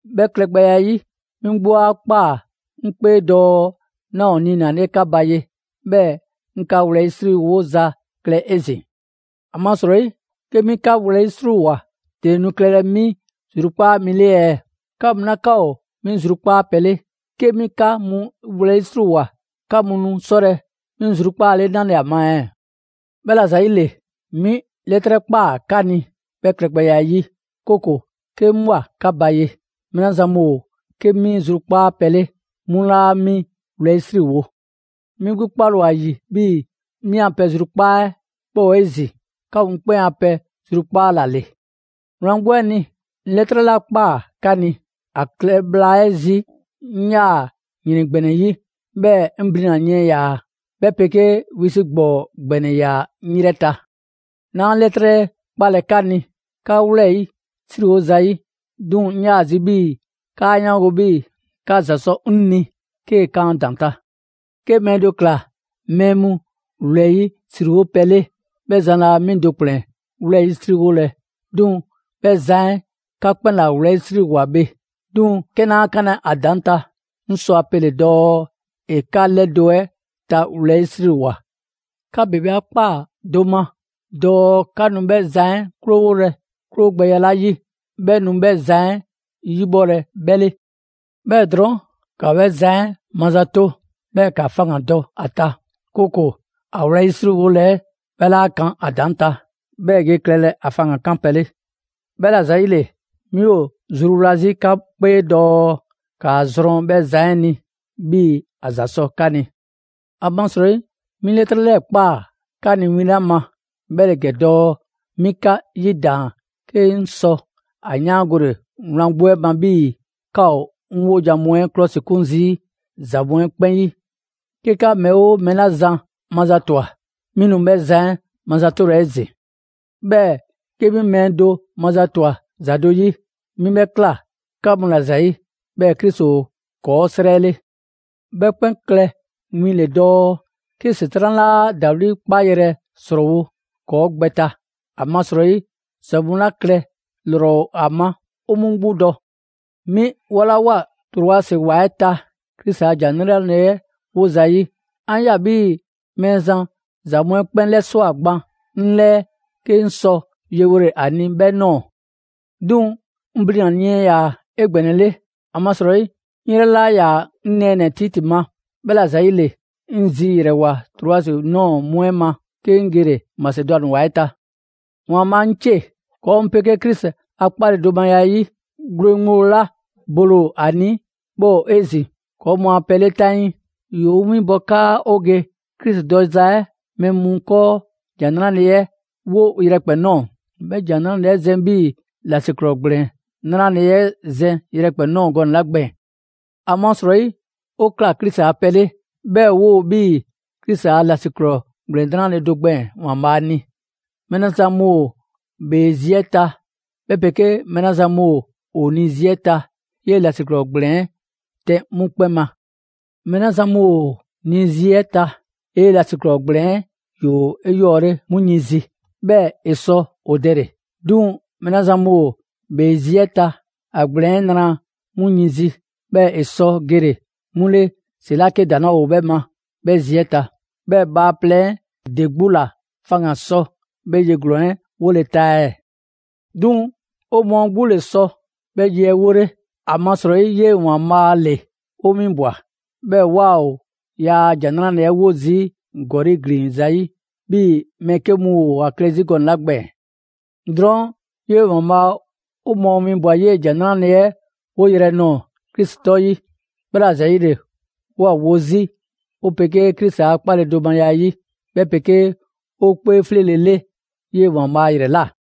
'Bhɛ klɛgbɛya 'ɛ 'yi, 'mi 'gbu 'a ꞊kpaa 'ŋ 'kpee dɔɔ 'naa ‑o niinale 'ka ba ye, 'bhɛɛ‑ 'ŋ 'ka wlɛyisriwoza klɛ 'ezin‑. ‑Amasrɔyi 'ke 'mi 'ka wlɛyisriwoa, ‑dele nu klɛlɛ 'mi zrukpaa mi 'le ɛɛ? 'Ka mu 'la 'ka ‑o 'mi zrukpaa' pɛ 'le, 'ke 'mi 'ka mu wlɛyisriwoa, 'ka mu nu 'sɔlɛ‑ 'mi zrukpaale 'nale‑ ‑a ma ɛɛ? 'Bhɛla‑ ‑zayile, 'mi 'lɛtrɛ ꞊kpaa 'ka ni 'bhɛ klɛgbɛya 'ɛ 'yi, 'kooko‑ 'ke 'ŋ ꞊bhwa 'ka ba ye, mɛɛ 'la zan mu ‑o 'ke 'mi zrukpaa pɛ le, 'mu 'laa 'mi wlɛyisriwo. 'Mi 'gbu 'kpale‑ ‑o ‑a ‑yi 'bhii‑ 'mi a pɛ zrukpaa' 'ɛ 'bhɛ ‑o 'ezin‑ 'ka mu 'kpɛn a pɛ zrukpaa' ‑la ‑le. Wlan 'gbu 'ɛ ni, 'ŋ 'lɛtrɛ 'la ꞊kpaa 'ka ni, ‑a klɛ bhla 'ɛ zi, 'ŋ 'yaa‑ ‑yrɛn ‑gbɛnɛ 'yi, 'bhɛɛ‑ 'ŋ blina‑ yiɛn ‑yaa, 'bhɛ 'pegee wisi' ‑gbɔɔ ‑gbɛnɛ ‑yaa 'ŋ 'yrɛ ta. 'Naa 'lɛtrɛ 'ɛ 'kpalɛ‑ 'ka ni 'ka wlɛyisriwo zayi', 'duŋ‑, 'ŋ 'yaa‑ zi 'bhii‑ 'kaa 'yaango‑ 'bhii‑ 'ka ‑za sɔ 'ŋ ni 'kee‑ kan ‑a ‑daŋ' ta. 'Ke mɛɛ do ꞊kla mɛɛ mu wlɛyisriwo pɛ 'le, 'bhɛ zan laa 'mi do ‑kplɛn wlɛyisriwolɛ, 'duŋ‑ 'bhɛ zan 'ɛ 'ka 'kpɛn ‑la wlɛyisriwoa bhe. 'Duŋ‑ 'ke 'naa 'kanlɛ‑ ‑a ‑daŋ' ta, 'ŋ sɔ ‑a pele‑ dɔɔ ‑e 'ka 'lɛdo‑ 'ɛ ta wlɛyisriwoa. 'Ka ‑bebe 'a ꞊kpaa do ma dɔɔ 'ka nu 'bhɛ zan 'ɛ 'krowolɛ 'krowogbɛya 'la 'yi, 'bhɛ nu 'bhɛ zan 'ɛ 'yibhɔlɛ 'bhɛ 'le. 'Bhɛɛ‑ drɔɔn', ‑ka 'bhɛ zan 'ɛ mazato, 'bhɛɛ‑ ‑ka faŋgandɔ ‑a ta; 'kooko‑ ‑a wlɛyisriwole 'ɛ 'bhɛ 'laa kan ‑a ‑daŋ' ta, 'bhɛɛ‑ 'bhɛ ge klɛlɛ ‑a faŋgan‑ 'kanpɛ‑ le. 'Bhɛla‑ ‑zayile, 'mi ‑o zruwla 'zi 'ka 'kpee dɔɔ ‑kaa zrɔn 'bhɛ zan 'ɛ ni 'bhii‑ ‑a ‑za sɔ 'ka ni. ‑Amasrɔyi 'mi 'lɛtrɛ ꞊kpaa 'ka ni win 'la ma, 'bhɛ ‑le ‑gɛ dɔɔ 'mi 'ka 'yidaan‑ 'ke 'ŋ sɔ ‑a 'yaangole wlan 'gbu 'ɛ ma 'bhii‑ 'ka ‑o 'ŋ 'wojan‑ mu 'ɛ 'klɔsikun zii' ‑za mu 'ɛ 'kpɛn 'yi. 'Ke 'ka mɛɛ 'oo mɛɛ 'la zan mazatwa, 'mi nu 'bhɛ zan 'ɛ mazatolɛ 'ezin‑. 'Bhɛɛ‑ 'ke 'mi mɛɛ do mazatwa ‑za do 'yi, 'mi 'bhɛ ꞊kla 'ka mu ‑la ‑zayi', 'bhɛɛ‑ Krisi ‑o ‑kɔɔ' 'srɛ 'le. 'Bhɛ 'kpɛn win le dɔɔ 'ke ‑Setran' 'laa ‑dawli' 'kpaayrɛ‑ ‑srɔɔwo' ‑kɔɔ' gbɛ ta. ‑Amasrɔyi ‑za mu 'la klɛ ‑lrɔ ‑o ‑a ma 'o 'mu 'gbu dɔ. 'Mi 'bhɔlawoa Troasi ‑wa 'ɛ ta Krisi a ‑Jan 'Nrale‑ 'ɛ 'wo zayi', 'an ꞊ya 'bhii‑ Mɛɛzan ‑za mu 'ɛ 'kpɛn 'lɛswa꞊ gban 'ŋ 'lɛɛ 'ke 'ŋ sɔ yewole ‑a ni 'bhɛ ꞊nɔɔ. 'Duŋ‑ 'ŋ blina‑ yiɛn ‑yaa 'egbɛnɛle, ‑amasrɔyi 'ŋ 'yrɛ 'laa ‑yaa 'ŋ nɛɛnɛ‑ Titi ma. 'Bhɛla‑ ‑zayile, 'ŋ zi ‑yrɛwole Troasi ꞊nɔɔ mu 'ɛ ma, 'ke 'ŋ gele‑ Masedwani ‑wa 'ɛ ta. ‑Waanbhaa' 'ŋcie! ‑Kɔɔ' mu 'pegee Krisi a 'kpaledomaya 'ɛ 'yi, gwle ŋgblo 'la bole ‑o ‑a ni, 'bhɛ ‑o 'ezin‑ ‑kɔɔ mu a pɛ 'le 'taŋii. ‑Yoo 'o winbɔ 'kaa 'o ge Krisi dɔza 'ɛ mɛɛ mu 'kɔɔ ‑Jan 'Nrale‑ 'ɛ 'wo yrɛkpɛn‑ ꞊nɔɔ, 'bhɛ ‑Jan 'Nrale‑ 'ɛ zɛn 'bhii‑ ‑lasiklɔɔ ‑gblɛn 'nrale‑ 'ɛ zɛn yrɛkpɛn‑ ꞊nɔɔ gɔnɛ‑ 'la gbɛɛn‑. ‑Amasrɔyi 'o ꞊kla Krisi a pɛ 'le, 'bhɛɛ‑ 'woo‑ 'bhii‑ Krisi a ‑lasiklɔɔ ‑gblɛn 'nrale‑ do gbɛɛn‑ ‑Waanbhaa' ni. Mɛɛ 'la zan mu ‑o ‑bhee zi 'ɛ ta, 'bhɛ 'pegee mɛɛ 'la zan mu ‑o ni zi 'ɛ ta, 'yee‑ ‑lasiklɔɔ ‑gblɛn 'ɛ tɛn 'mu 'kpɛn ma. Mɛɛ 'la zan mu ‑o ni zi 'ɛ ta, 'yee‑ ‑lasiklɔɔ ‑gblɛn 'ɛ ‑yoo 'eyɔɔle 'mu yin zi, 'bhɛɛ‑ ‑e sɔ ‑o dɛle‑. 'Duŋ‑ mɛɛ 'la zan mu ‑o ‑bhee zi 'ɛ ta, ‑a ‑gblɛn 'ɛ nra 'mu yin zi, 'bhɛɛ‑ ‑e sɔ gele 'mu ‑le ‑si 'la 'ke ‑daŋ' 'laa ‑o 'bhɛ ma, 'bhɛ a zi 'ɛ ta. 'Bhɛɛ‑ bhaaplɛŋ 'ɛ ‑de 'gbu ‑la faŋgan‑ sɔ 'bhɛ ye ‑glɔɔn 'ɛ 'wole‑ ta ɛɛ? 'Duŋ‑ 'o mɔɔ 'gbu ‑le sɔ 'bhɛ ye 'ɛ 'wole, ‑amasrɔyi 'yee‑ ‑Waanbhaa' ‑le 'o 'winbwa‑. 'Bhɛɛ‑ 'waa ‑o yaa ‑Jan 'Nrale‑ 'ɛ 'wo zii' ‑gɔli' ‑glin zayi', 'bhii‑ mɛɛ 'ke mu ‑o ‑a klɛ 'zi gɔnɛ‑ 'la gbɛɛn‑. Drɔɔn' 'yee‑ ‑Waanbhaa 'o mɔɔ winbwa‑ 'yee‑ ‑Jan 'Nrale‑ 'ɛ 'woyrɛ‑ nɔɔ‑ Krisi 'tɔ 'yi. 'Bhɛla‑ ‑zayile, 'woo‑ ‑a wo 'zi 'o 'pegee Krisi a 'kpaledomaya 'ɛ 'yi, 'bhɛ 'pegee 'o 'kpee 'fleele‑ 'le 'yee‑ ‑Waanbhaa' ‑yrɛ ꞊la.